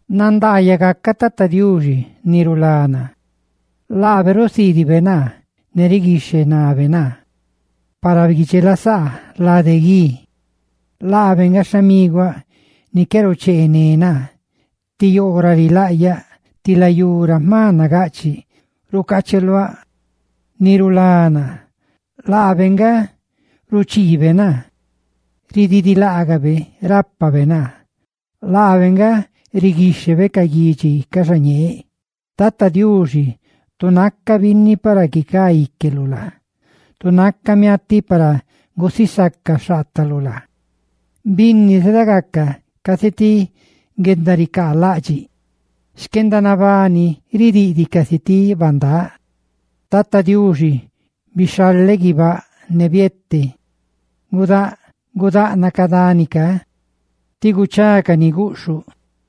¡Nandaayaꞌ gacaꞌ Tata Diuxi, ni rulá naa! Laabe rusiidibe ne riguixhenabe naa para guidxelasaaꞌ lade gui; laabe nga xhamiguáꞌ ni qué rucheené naa, ti yoo ra rilaꞌyaꞌ, ti layú ra jma nagaꞌchiꞌ rucacheluáꞌ, ni rulá naa; laabe nga ruchiibe naa, ne laabe rápabe naa; laabe nga riguixhebe ca guidxi ca xañeeꞌ. Tata Diuxi, tu naca binni, para guicá íqueluꞌ laa. Tu naca miatiꞌ, para gusisaca xhaataluꞌ laa. Binni zedagaca casi ti guendaricaalaꞌdxiꞌ; xquendanabani ridiꞌdiꞌ casi ti bandáꞌ. Tata Diuxi, bixhaleꞌ ndaga guibáꞌ, ne biete; gudaꞌnaꞌ ca dani ca ti guchacaꞌ guꞌxhuꞌ;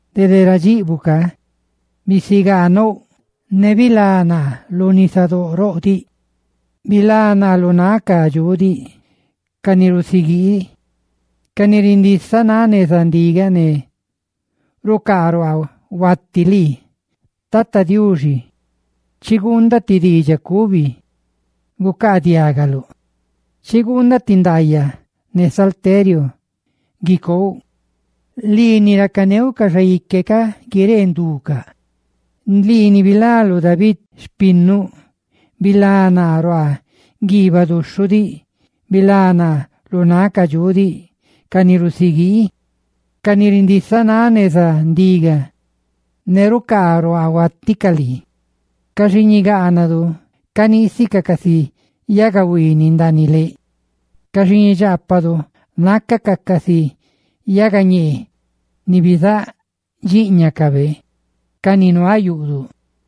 Dede ra dxiꞌbuꞌ ca bisigaa nouꞌ, ne bilá naa lu nisadóꞌ roꞌ diꞌ, bilá naa lu náꞌ ca dxuꞌ diꞌ, ca ni rusiguii ne rindisanáꞌ ndigacaꞌ ne rucaaruaa huaticaꞌ lii. Tata Diuxi, chiguundaꞌ ti diidxaꞌ cubi gucaadiagaluꞌ; chiguundaꞌ ti ndaayaꞌ ne salteriu guicouꞌ. Lii, ni racaneuꞌ ca xaique ca guiree nducaꞌ; lii, ni bilaluꞌ David ni runi xhiiñaluꞌ, bilá naa ruaa guiibaꞌ duxhuꞌ diꞌ; bilá naa lu náꞌ ca dxuꞌ diꞌ, ca ni rusiguii ne rindisanáꞌ ndigacaꞌ ne rucaaruaa huaticaꞌ lii. Ca xiiñidu caniisicaꞌ casi yagahuiiniꞌ ndaaniꞌ leꞌ; ca xiiñidxaapadu nácacaꞌ casi yagañee ni bizáꞌ dxiiñacabe ca ni nuaꞌ ca yagaruaa xtiꞌ yuꞌduꞌ.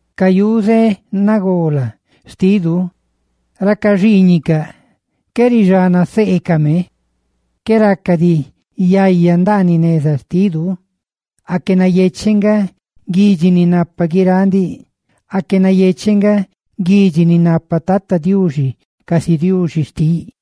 Ca yuze nagola xtidu racaxhiiñicaꞌ, qué rixana seecame. Qué raca diꞌ ridxi yaya ndaaniꞌ neza xtidu. ¡Aque nayecheꞌ nga guidxi ni napa guiráꞌ ndiꞌ! ¡Aque nayecheꞌ nga guidxi ni napa Tata Diuxi casi Diuxi xtiꞌ!